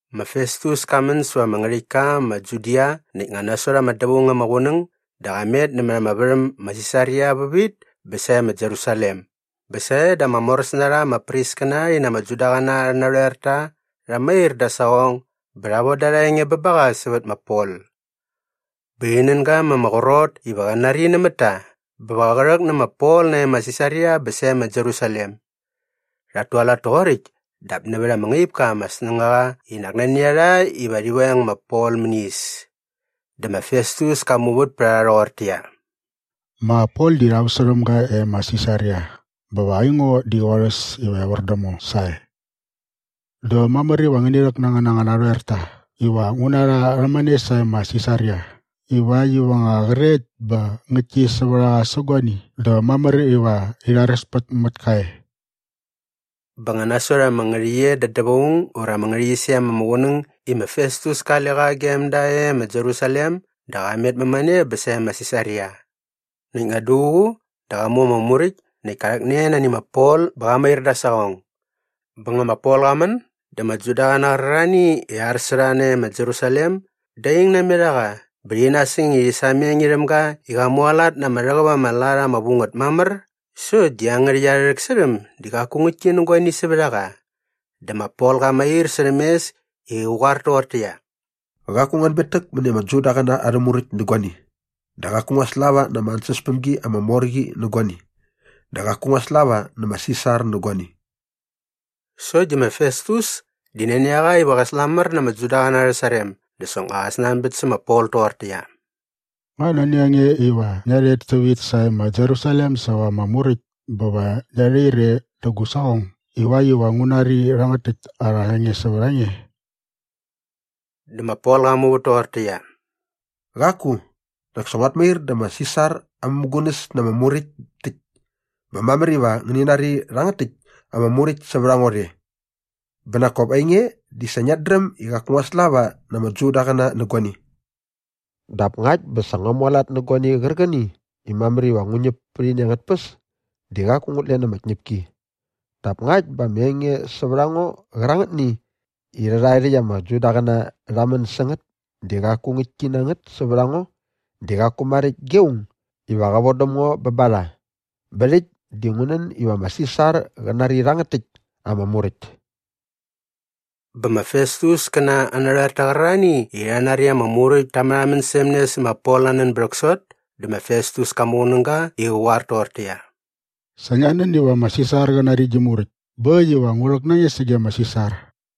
Ma Festus ka män säva ama ngärhäktka ma Judia näkt nga nasot ama dävaung ama qunäng dä qa met nämät ama värhäm ma Sisaria vävit bä sae ma Jerusalem bä sae dä ama moräs na rha ama priskäna rhi na ama Judaqäna arhä narhoerta rha mair da aa saqong bä rha voda arha enge bä ba qa sävät ma Pol. Bä rhi nän ga ma ama qrot iva qa nari nämät ta bä va qä rhäk nä ma Pol nae ma Sisaria bä sae ma Jerusalem. Rhat tualat toqoräkt dap nävät ama ngaip ka ama snängaqa i nak nani a rha iva rhi veng ma Pol mäni is. Dä ma Festus ka muvät pät a rha rhoqortäqyia, “Ma Pol di rha väsärhäm ga e ma Sisaria bä va aingo di qorhäs iva evär däm ngo sae. Dä mamär iva ngäni rhäk na angän anga narhoerta iva ngu na rha rhämane sae ma Sisaria ivakt iva nga qrekt bä ngäktki sävät a qa sä guani dä mamär iva rhi rharespät mät ka e.” Bä nga nasot ama ngärhäqyet da dävaung ura ama ngärhäqyisem ama qunäng i ma Festus kale qa gem da e ma Jerusalem dä qa met mämane bä sae ma Sisaria. Näkt nga duququ dä qa mu ama muräkt näkt ka rhäkne nani ma Pol bä qa mair da aa saqong. Bä nga ma Pol qa män dä ama Judaqäna qärarhani i ar sä rha nae ma Jerusalem da ing namet a qa bä rhi nasäng i rhi sameng irhäm ga i qa mualat na ama rhäqäp ama lat ama vu ngät mamär sokt di iangärhäkt arhä rhäksärhäm di qaku ngäktki nä guani sävät a qa. Dä ma Pol qa mair särhäm mes i qä qoar toqortäqyia, “Qaku ngua anbetäk mäni ama Judaqäna arhä Muräkt nä guani dä qaku ngua slava na ama ansäspämgi ama mor qi nä guani dä qaku ngua slava nä ma Sisar nä guani.” Sokt di ma Festus di nani a qa iva qä slamär na ama Judaqäna arhä sarem dä soknga qa snanbät sä ma Pol toqortäqyia, “Nga nani a nge iva ngia rhet tävit sae ma Jerusalem säva ama muräkt bä va ngia rhair e dä gu saqong ivakt iva ngu nari rhärhangät täkt arha enge sävät a nge?” Dä ma Pol qa muvät toqortäqyia, “Qaku, nak sa nguat mair vä ma Sisar aa mämugunäs na ama muräkt täkt bä mamär iva ngi nari rhangät täkt ama muräkt sävät a ngo rhe. Bä nak kop ainge di sa ngiat dräm i qaku ngua slava na ama Judaqäna nä guani.” Dap ngakt bä sa ngua mualat nä guani qärqäni i mamär iva ngu ñäp pät ini angät tpäs di qaku ngut len ama tñäpki. Dap ngakt bä ama enge sävät a ngo qärangätni i rhaerhärhae ama Judaqäna rha män sä ngät di qaku ngäktki na ngät sävät a ngo di qaku maräkt ge aung iva qä vodäm ngo bä ba rha. Bä rhäkt di ngu nän iva ma Sisar qä nari rhangät täkt ama muräkt. Bä ma Festus kä na aa narhoerta qärarhani i rha nari ama muräkt ta märhamän särhäm ne sä ma Pol aa nän bä rhäksot dä ma Festus ka muqunäga i qä qoar toqortäqyia, “Sa ngia nän iva ma Sisar qä nari gi muräkt bä äkt iva ngu rhäk na nge sage ma Sisar.”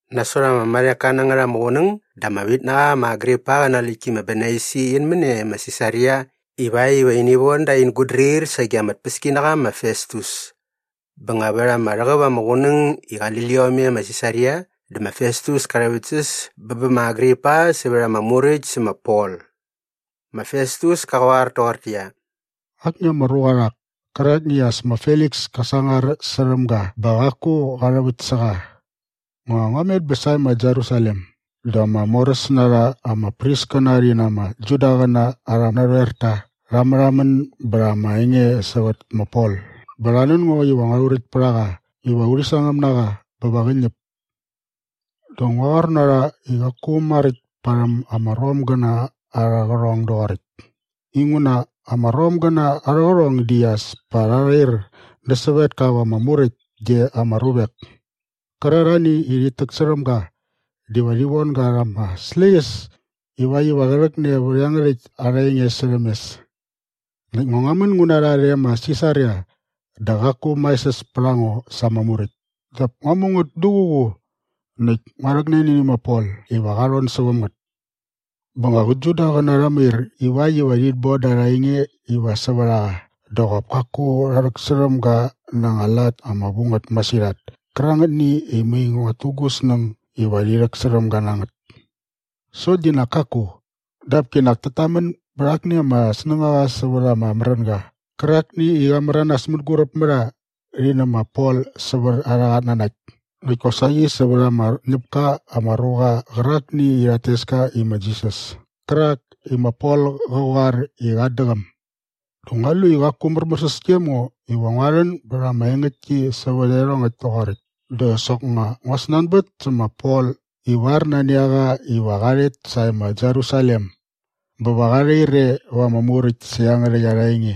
Nasot ama marheka na ngät ama qunäng dä ama vitnaqa ma Agripa qä na aa läktki ma Bernaisi in män e ma Sisaria ivakt iva ini von da ain gutdrir sage ama tpäskinaqa ma Festus. Bä nga vät ama rhäqäp ama qunäng i qali liom e ma Sisaria dä ma Festus ka rhäväktsäs bä bä ma Agripa sävät ama muräkt sä ma Pol. Ma Festus ka qoar toqortäqyia, “Akni ama ruqa rhak kärakni i as ma Feliks ka sangar särhäm ga bä qaku qa rhäväkt sä qa. Nga ngua met bä sae ma Jerusalem dä ama moräs na rha ama priskäna rhi na ama Judaqäna arhä narhoerta rha märhamän bät ama enge sävät ma Pol bä rha nän ngo iva ngua rhuräkt pät a qa iva urhi sangäm na qa bä va qä ñäp. Dä ngua qoar na rha i qaku maräkt parhäm ama Romgäna arhä qärhong doqoräkt inguna ama Romgäna arhä qärhong di as pa rha rhair nä sävetka va ama muräkt ge ama ruvek kärarhani i rhit täksärhäm ga dä va rhi von ga rha ama släqyäs ivakt iva qä rhäkne vät iangärhäkt arha enge särhäm mes. “Näkt nga ngua män ngu na rha rhe ma Sisaria dä qaku maesäs pät a ngo sa ama muräkt dap ngua mu ngät duququ näkt ngua rhäkne nani ma Pol iva qa rhon säväm ngät. Bä nga qä Judaqäna rha mair ivakt iva rhit boda arha enge iva sävät a qa dä qop kaku rha rhäksärhäm ga na anga lat ama vu ngät masirhat kärangätni i mai nguat tu gu snäng iva rhi rhäksärhäm ga na ngät. Sokt di nak kaku. Dap kinak tat tamän bät akni ama snängaqa sävät ama märänga qärakni i qa märanas mänguräp mä rha rhi nä ma Pol sävät arhä qatnanakt näkt kosaqi sävät ama ñäp ka ama ruqa qärakni i rhat tes ka i ma Jisas kärak i ma Pol qa qoar i qat däqäm. “Dä ngua lu i qaku märmärsäs gem ngo iva ngua rhän bät ama engäktki sävät iarhongäkt toqoräkt dä soknga ngua snanbät sä ma Pol ivar nani a qa iva qa rhet sae ma Jerusalem bä va qa rhair e va ama muräkt sä iangärhäkt arha enge.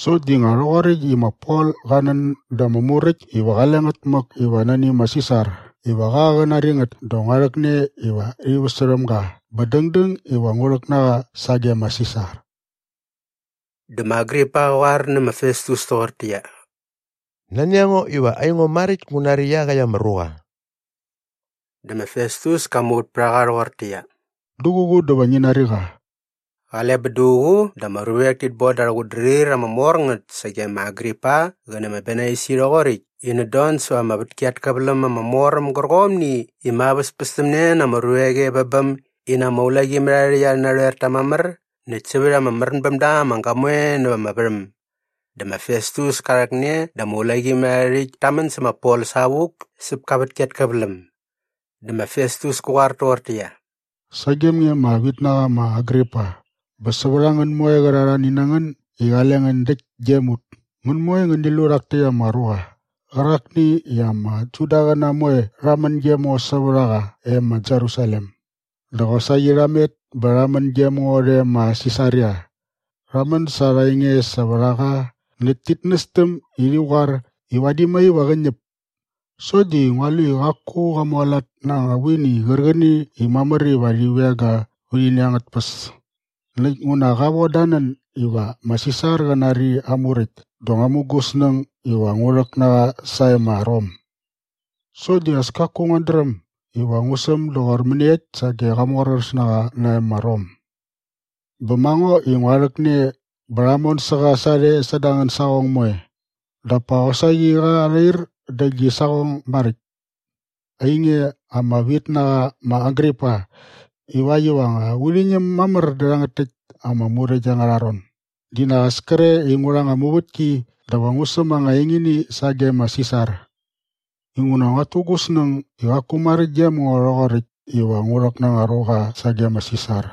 Sokt di nga rhoqoräkt i ma Pol qa nän da ama muräkt iva qale ngät mäk iva nani ma Sisar iva qa qä nari ngät dä ngua rhäkne iva rhi väsärhäm ga bä dängdäng iva ngu rhäk na qa sage ma Sisar.” Dä ma Agripa qä qoar nä ma Festus toqortäqyia, “Nani a ngo iva aingo maräkt ngu nari iaqäkt ama ruqa.” Dä ma Festus ka muvät pät a qa rhoqortäqyia, “Duququ dä va ngi nari qa.” Qale bä duququ dä ama ruvek tit boda arhä qutdrir ama mor ngät sage ma Agripa qä nä ma Bernaisi rhoqoräkt i init don säva ama vätki at käväläm ama mor äm gärqomni i ma väspästämne na ama ruvek e vä bäm in na ama ulaqimärharhärhäkt arhä narhoerta mamär näkt sävät ama märän bäm da ama gamoe näva ama värhäm. Dä ma Festus ka rhäkne dä ama ulaqimärharhärhäkt ta män sä ma Pol savuk säp ka vätki at käväläm. Dä ma Festus kä qoar toqortäqyia, “Sagem nge ama vitnaqa ma Agripa bä sävät a ngän moe qärarhani na ngän i qale ngän däkt gem ut, ngän moe ngäni lu rhak täkt ama ruqa qärakni i ama Judaqäna moe rha män gem ngo sävät a qa e ma Jerusalem dä qosaqi rha met bä rha män gem ngo rhe ma Sisaria. Rha män sa arha enge sävät a qa näkt tit nästäm i rhi qoar i vadi mai va qä ñäp. Sokt di ngua lu i qaku qa mualat na anga vuini qärqäni i mamär iva rhi veng ga vät ini angät tpäs. Näkt nguna qa voda aa nän iva ma Sisar qä nari aa muräkt dä ngua mu gu snäng iva ngu rhäk na qa sae ma Rom. “Sokt di as kaku nguat dräm iva ngu säm doqor mäniekt sage qa moräsnaqa nae ma Rom. Bä ma ngo i ngua rhäkne bä rha mon sä qa sarhe säda angän saqong moe dap pa qosaqi qa rhair dä gi saqong maräkt, ainge ama vitnaqa ma Agripa, ivakt iva nga urhi ñäm mamär dä rhangät täkt ama muräkt angärha ron dä nak as kre i ngu rha anga muvätki dä va ngu säm anga engini sage ma Sisar. Inguna nguat tu gu snäng i qaku maräkt gem ngo rhoqoräkt iva ngu rhäk na anga ruqa sage ma Sisar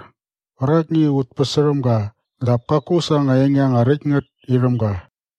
qärakni i ut päsärhäm ga dap kaku sa anga enge anga räkt ngät irhäm ga.”